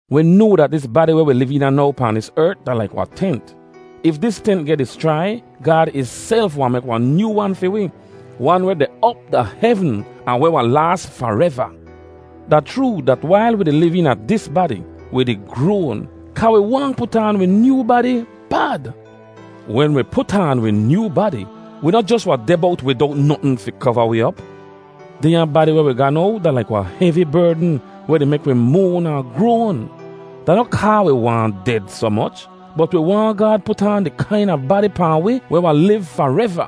Wi noa dat dis badi weh wi liv eena now pahn dis ert da laik wahn tent. If dis tent geh dischrai, Gaad ihself wahn mek wahn nyoo wan fi wi, wan weh deh op da hevn, ahn weh wahn laas fareva. Da chroo dat wail wi di liv eena dis badi, wi di groan, kaa wi waahn put aan wi nyoo badi bad. Wen wi put aan wi nyoo badi, wi noh jos wahn deh bowt widowt notn fi kova wi op. Dehnya badi weh wi ga now da laik wahn hevi berdn weh di mek wi moan ahn groan. Da noh kaa wi waahn ded soh moch, bot wi waahn Gaad put aan di kaina badi pahn wi weh wahn liv fareva.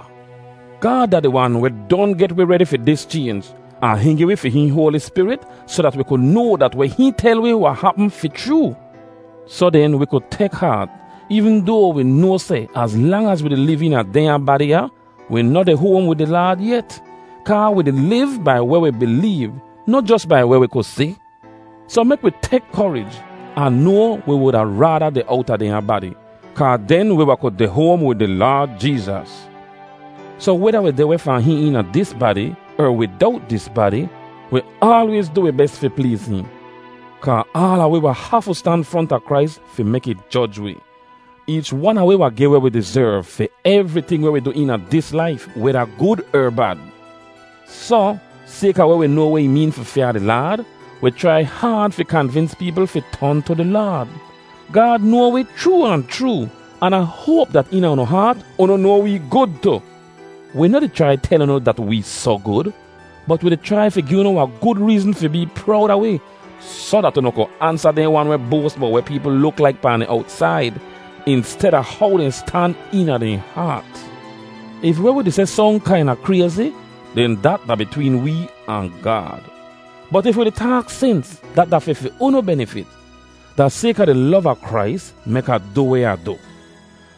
Gaad da di Wan weh don get wi redi fi dis chaynj, ahn hihn gi wi fi hihn Hoali Spirit soh dat wi ku noa dat weh hihn tel wi wahn hapm fi chroo. Soh den, wi ku tek haat, eevn doa wi noa seh az lang az wi di liv eena dehnya badi ya, wi noh deh hoam wid di Laad yet; kaa wi di liv bai weh wi bileev, noh jos bai weh wi ku si. Soh mek wi tek korij. Ah noa wi wuda raada deh owta dehnya badi, kaa den wi wahn ku deh hoam wid di Laad Jeezas. Soh, weda wi deh weh fahn hihn eena dis badi, er widowt dis badi, wi aalwayz du wi bes fi pleez hihn. Kaa aala wi wahn hafu stan fronta Krais fi mek ih joj wi. Eech wan a wi wahn geh weh wi dizerv fi evriting weh wi du eena dis laif, weda gud er bad. Soh, sayka weh wi noa weh ih meen fi fyaa di Laad, wi chrai haad fi kanvins peepl fi ton tu di Laad. Gaad noa wi chroo ahn chroo, an Ah hoap dat eena unu haat unu noa wee gud tu. Wi noh di chrai tel unu dat wee soh gud. Bot wi di chrai fi gi unu wahn gud reezn fi bee prowd a wi, soh dat unu ku ansa dehn wan weh boas bowt weh peepl luk laik pahn di owtsaid insteda how dehn stan eena dehn haat. If weh wi di seh song kaina krayzi, den dat da bitween wee ahn Gaad. Bot if wi di taak sens, da fi fi unu benifit. Da sayka di lov a Krais mek Ah du weh Ah du.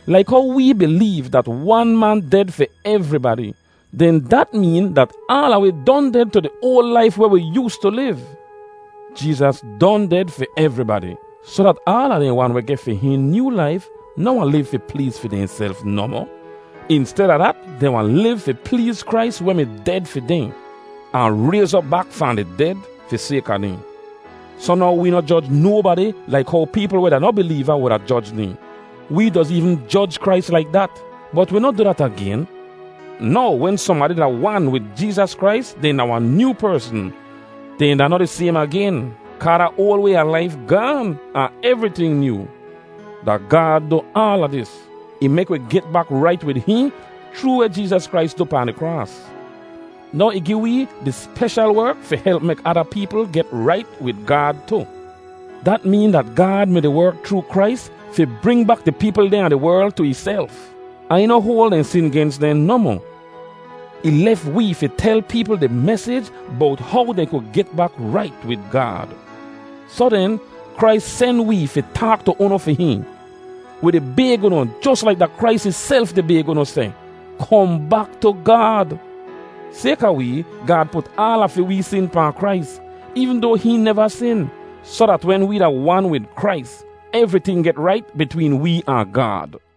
Laik how wee bileev dat wan man ded fi evribadi, den dat meen dat aala wi don ded tu di oal laif weh wi yoostu liv. Jeezas don ded fi evribadi, soh dat aala dehn wan weh geh fi hihn nyoo laif noh wahn liv fi pleez fi dehnself nohmoh. Insteda dat, dehn wahn liv fi pleez Krais weh mi ded fi dehn, ahn rayz op bak fahn di ded fi sayka dehn. Soh now wee noh joj nobadi laik how peepl weh da noh bileeva wuda joj dehn. Wee doz eevn joj Krais laik dat, bot wi noh du dat agen. Now wen sohnbadi da wan wid Jeezas Krais, dehn da wahn nyoo persn. Dehn da noh di saym agen, kaa da oal way a laif gaan, ahn evriting nyoo! Da Gaad du aala dis. Ih mek wi get bak rait wid hihn chroo weh Jeezas Krais du pahn di kraas. Now ih gi wee di speshal werk fi help mek ada peepl get rait wid Gaad tu. Dat meen dat Gaad mi-di werk chroo Krais fi bring bak di peepl dehn a di werl tu ihself; ahn ih noh hoal dehn sin gens dehn nohmoh. Ih lef wee fi tel peepl di mesij bowt how dehn ku get bak rait wid Gaad. Soh den, Krais sen wee fi taak tu unu fi hihn. Wi di bayg unu jos laik da Krais ihself di bayg unu seh, “Kohn bak tu Gaad.” Sayka wee, Gaad put aala fi wee sin pahn Krais, eevn doa hihn neva sin, soh dat wen wee da wan wid Krais, evriting get rait bitween wee ahn Gaad.